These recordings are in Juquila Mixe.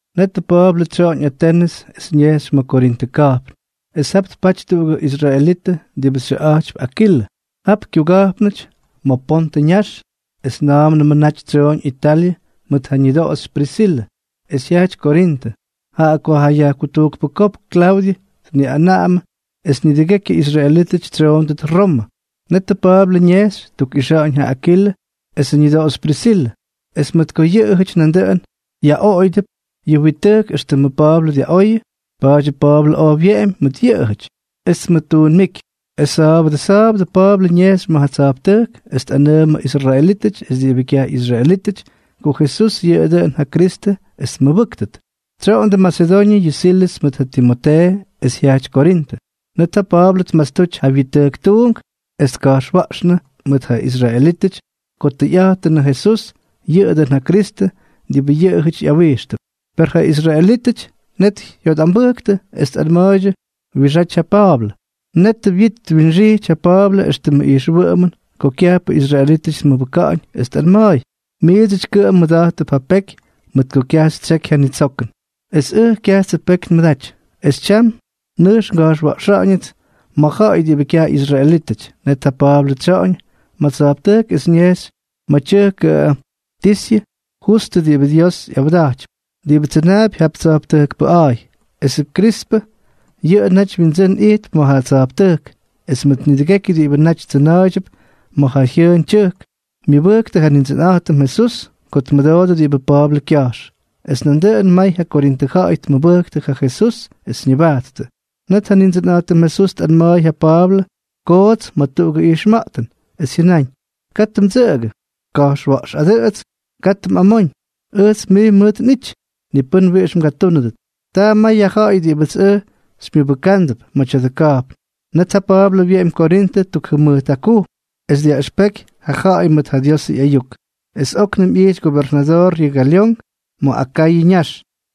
Netʉ Pa̱a̱blʉ tsyoꞌoñ Atenʉs es ñejxy ma̱ Korintʉ ka̱jpn. Es jap tpaty tuꞌugʉ israelitʉ diꞌibʉ xyʉꞌa̱jtypy Akilʉ, jap kyuga̱jpnʉty ma̱ Pontʉ ñax es na̱a̱mnʉmʉ naty tsyooñ Italyʉ mʉt ja ñʉdoꞌoxy Prisilʉ, es jyajty Korintʉ, jaꞌa ko ja yajkutujkpʉ kopk Klaudyʉ tniꞌanaꞌamʉ es nidʉgekyʉ israelítʉty tsyoondʉt Romʉ. Netʉ Pa̱a̱blʉ ñejxy tkuꞌixa̱ꞌa̱ñ ja Akilʉ esʉ ñʉdoꞌoxy Prisilʉ, es mʉt ko yʉꞌʉjʉty nandʉꞌʉn yaꞌoꞌoyʉdʉp yʉ wit tʉjk éxtʉmʉ Pa̱a̱blʉ dyaꞌoyʉ, pa̱a̱dyʉ Pa̱a̱blʉ oj wyeꞌemy mʉt yʉꞌʉjʉty, es tmʉttuunmijky. Es sa̱a̱bʉdʉ sa̱a̱bʉdʉ Pa̱a̱blʉ ñejxy ma̱ tsa̱jptʉjk es tꞌanʉʉmʉ israelítʉty es diꞌibʉ kyaj ꞌyisraelítʉty, ko Jesús yʉꞌʉ dʉꞌʉn ja Kristʉ es tmʉbʉ́ktʉt. Tsyoꞌondʉ Masedoñʉ yʉ Silʉs mʉt ja Timotee es jyajty Korintʉ. Net ja Pa̱a̱blʉ tmastuty ja wyit tʉjk tuunk es tka̱jxwa̱ꞌxnʉ mʉt ja israelítʉty ko tʉyꞌa̱jtʉnʉ Jesús yʉꞌʉ dʉꞌʉn ja Kristʉ diꞌibʉ yʉꞌʉjʉty ꞌyawijxtʉp. Per ja israelítʉty net jyotꞌambʉjktʉ es tꞌanma̱a̱ydyʉ wiꞌixáty ja Pa̱a̱blʉ. Netʉ wyit twinxijty ja Pa̱a̱blʉ éxtʉmʉ ijxwʉꞌʉmʉn ko kyajpʉ israelítʉty tmʉbʉka̱ꞌa̱ñ, es tꞌanma̱a̱y: —Miidsʉty kʉꞌʉm mmʉda̱jttʉp ja peky mʉt ko kyaj xytsyeky ja nitsokʉn. Es ʉj kyajtsʉ peky nmʉdaty. Es tyam nʉjx nga̱jxwa̱ꞌxa̱ꞌa̱ñʉts ma̱ ja̱ꞌa̱y diꞌibʉ kyaj ꞌyisraelítʉty. Net ja Pa̱a̱blʉ tsyoꞌoñ ma̱ tsa̱jptʉjk es ñejxy ma̱ tyʉjkʉ Tisyʉ Justʉ diꞌibʉ Dios ꞌyawda̱jtypy, diꞌibʉ tsyʉnaapy jap tsa̱jptʉjk pʉꞌa̱a̱y. Esʉ Krispʉ yʉꞌʉ naty windsʉ́n ijtp ma̱ ja tsa̱jptʉjk, es mʉt nidʉgekyʉ diꞌibʉ naty tsʉna̱a̱ydyʉp ma̱ ja jyʉʉn tyʉjk myʉbʉjktʉ ja Nindsʉnꞌa̱jtʉm Jesús ko tmʉdoodʉ diꞌibʉ Pa̱a̱blʉ kya̱jx, es nandʉꞌʉn may ja Korintʉ ja̱ꞌa̱y tmʉbʉjktʉ ja Jesús es ñʉbajttʉ. Net ja Nindsʉnꞌa̱jtʉm Jesús tꞌanma̱a̱y ja Pa̱a̱blʉ koots ma̱ tuꞌugʉ ijxma̱ꞌtʉn, es jyʉnáñ: —Katʉ mdsʉꞌʉgʉ. Ka̱jxwa̱ꞌxꞌadʉꞌʉts. Katʉ mꞌamóñ. Ʉjts mij mʉt nꞌity. Ni pʉ́n wiꞌix mgatúnʉdʉt. Taa may ja ja̱ꞌa̱y diꞌibʉts ʉj xymyʉbʉkándʉp ma̱ tya̱dʉ ka̱jpn. Net ja Pa̱a̱blʉ wyeꞌemy Korintʉ tuk jʉmʉjt jakujm, es dyaꞌʉxpeky ja ja̱ꞌa̱y mʉt ja Diosʉ ꞌyayuk. Es óknʉm ꞌyijty gobernadoor yʉ Galyón ma̱ Akayʉ ñax.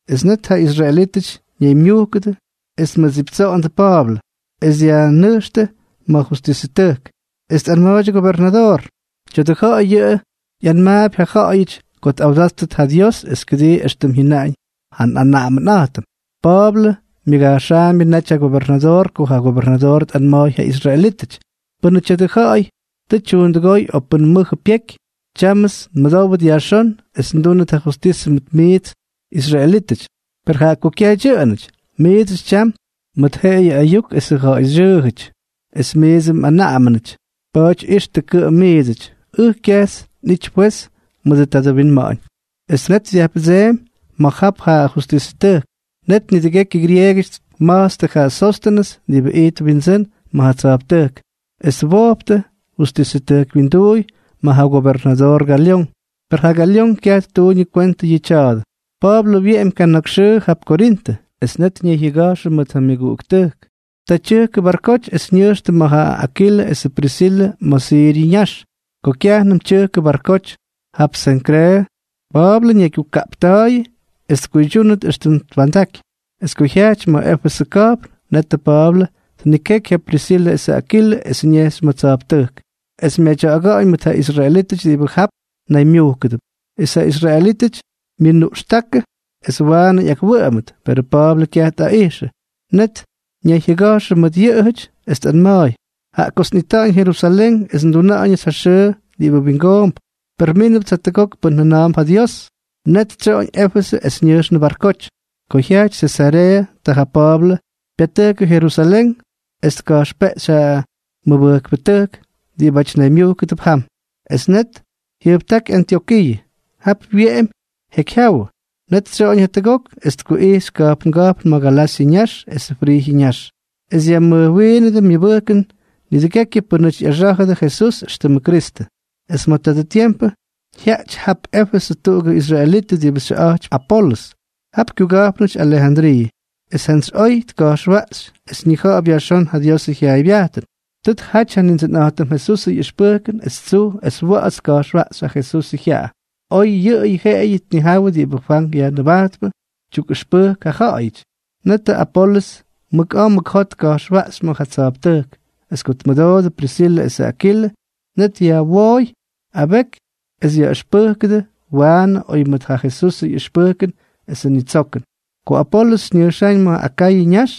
Es net ja israelítʉty ñaymyujkʉdʉ es tmʉdsiptsoꞌondʉ Pa̱a̱blʉ, es dyajnʉjxtʉ ma̱ justisʉtʉjk. Es tꞌanma̱a̱ydyʉ gobernadoor: —Tya̱dʉ ja̱ꞌa̱y yʉꞌʉ ꞌyanmaapy ja ja̱ꞌa̱yʉty ko tꞌawdáttʉt ja Dios es kʉdii éxtʉm jyʉnaꞌañ ja nꞌanaꞌamʉnꞌa̱jtʉm. Pa̱a̱blʉ myʉga̱jxaambyʉ naty ja gobernadoor ko ja gobernadoor tꞌanma̱a̱y ja israelítʉty: —Pʉnʉ tya̱dʉ ja̱ꞌa̱y tʉ tyuundʉgóy o pʉn mʉjʉ pyeky, tyámʉts nmʉdówʉt yajxón es ndúnʉt ja justisʉ mʉt miits israelítʉty; per jaꞌa ko kyaj dyʉꞌʉnʉty, miidsʉty tyam mꞌʉʉndʉ mʉt jeꞌeyʉ ayuk es ja̱ꞌa̱y xyʉʉjʉty es miidsʉ mꞌanaꞌamʉnʉty, pa̱a̱ty ixtʉ kʉꞌʉm miidsʉty. Ʉj, kyajts nꞌity fwez mʉdʉ tadʉ winma̱ꞌa̱ñ. Es net dyajpʉdseemy ma̱ jap ja justisʉtʉjk. Net nidʉgekyʉ grieegʉty tma̱jtstʉ ja Sóstʉnʉs diꞌibʉ ijtp windsʉ́n ma̱ ja tsa̱jptʉjk, es twojptʉ justisʉtʉjk wyinduuy ma̱ ja gobernadoor Galyón. Per ja Galyón kyaj ttuuñʉ kwentʉ yʉ tya̱a̱dʉ. Pa̱a̱blʉ wyeꞌemy kana̱k xʉʉ jap Korintʉ. Es net ñayjyʉga̱jxʉ mʉt ja myʉguꞌuktʉjk. Taa tyʉjkʉnʉ barkoty es ñʉjxtʉ mʉt ja Akilʉ esʉ Prisilʉ ma̱ Siryʉ ñax. Ko kyajnʉm tyʉkʉ barkoty jap Senkreeʉ, Pa̱a̱blʉ ñaygyukaꞌpta̱a̱yʉ es tkuydyúnʉt éxtʉm twa̱ndaky. Es ko jyajty ma̱ Éfesʉ ka̱jpn, netʉ Pa̱a̱blʉ tnikeky ja Prisilʉ esʉ Akilʉ es ñejxy ma̱ tsa̱jptʉjk, es myadya̱ꞌa̱ga̱ꞌa̱ñ mʉt ja israelítʉty diꞌibʉ jap naymyujkʉdʉp. Es ja israelítʉty myʉnuꞌxtákʉ es waanʉ ꞌyakwʉꞌʉmʉt, perʉ Pa̱a̱blʉ kyaj tꞌaꞌijxʉ. Net ñayjyʉga̱jxʉ mʉt yʉꞌʉjʉty, es tꞌanma̱a̱y: —Jaꞌa kots nꞌita̱ꞌa̱ñ Jerusalén es nduna̱ꞌa̱ñʉts ja xʉʉ diꞌibʉ wingoomp. Per mínʉpts jatʉgok pʉn jʉna̱a̱mp ja Dios. Net tsyoꞌoñ Éfesʉ es ñʉjxnʉ barkoty. Ko jyajty Sesareeʉ, ta ja Pa̱a̱blʉ pyatʉjkʉ Jerusalén es tka̱jxpeꞌxy ja mʉbʉjkpʉtʉjk diꞌibáty naymyujkʉdʉp jam. Es net jyʉjptáky Antyokiiʉ. Jap wyeꞌemy jekyjyawʉ. Net tsyoꞌoñ jatʉgok es tkuꞌijxy ka̱jpnga̱jpn ma̱ Galasyʉ ñax es Frijyʉ ñax, es dyajmʉjwiinʉdʉ myʉbʉjkʉn nidʉgekyʉ pʉ́nʉty ꞌyaxá̱jʉdʉ Jesús éxtʉmʉ Kristʉ. Es ma̱ tadʉ tiempʉ jyajty jap Éfesʉ tuꞌugʉ israelitʉ diꞌibʉ xyʉꞌa̱jtypy Apolʉs. Jap kyuga̱jpnʉty Alejandriiʉ. Es jantsy oy tka̱jxwaꞌxy, es ñija̱ꞌa̱p yajxón ja Diosʉ jyaaybyajtʉn. Tʉ tjaty ja Nindsʉnꞌa̱jtʉm Jesusʉ ꞌyʉxpʉjkʉn es tsuj es wa̱ꞌa̱ts tka̱jxwaꞌxy ja Jesusʉ jyaꞌa, oy yʉꞌʉyʉ jeꞌeyʉ tnijawʉ diꞌibʉ Fwank Yajnʉbajtpʉ tyukꞌʉxpʉjk ja ja̱ꞌa̱yʉty. Netʉ Apolʉs mʉk a̱a̱ mʉk jot tka̱jxwaꞌxy ma̱ ja tsa̱jptʉjk. Es ko tmʉdoodʉ Prisilʉ esʉ Akilʉ, net yajwooy abeky es yaꞌʉxpʉjknʉdʉ waanʉ oy mʉt ja Jesusʉ ꞌyʉxpʉjkʉn esʉ ñitsokʉn. Ko Apolʉs ñʉjxáñ ma̱ Akayʉ ñax,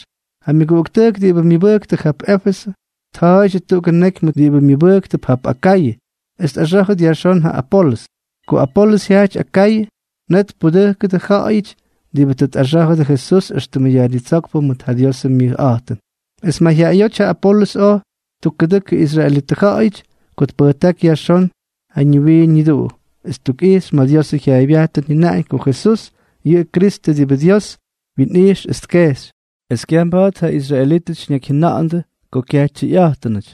ja myʉguꞌuktʉjk diꞌibʉ myʉbʉjktʉ jap Éfesʉ tja̱a̱ydyʉ tuꞌugʉ neky mʉt diꞌibʉ myʉbʉjktʉp jap Akayʉ, es tꞌaxá̱jʉt yajxón yʉ Apolʉs. Ko Apolʉs jyajty Akayʉ, net tpudʉjkʉdʉ ja̱ꞌa̱yʉty diꞌibʉ tʉ tꞌaxá̱jʉdʉ Jesús éxtʉmʉ Yajnitsókpʉ mʉt ja Diosʉ myayꞌa̱jtʉn. Es mayjyaꞌayóty ja Apolʉs oj ttukkutʉkʉ israelitʉ ja̱ꞌa̱yʉty ko tpʉjtáky yajxón ja ñiwiin ñiduꞌu, es ttukꞌixy ma̱ Diosʉ jyaaybyajtʉn jyʉnaꞌañ ko Jesús yʉꞌʉ Kristʉ diꞌibʉ Dios wyinꞌijx es tkejxy. Es kyaj mba̱a̱t ja israelítʉty ñakyjyʉna̱ꞌa̱ndʉ ko kyaj tʉyꞌa̱jtʉn.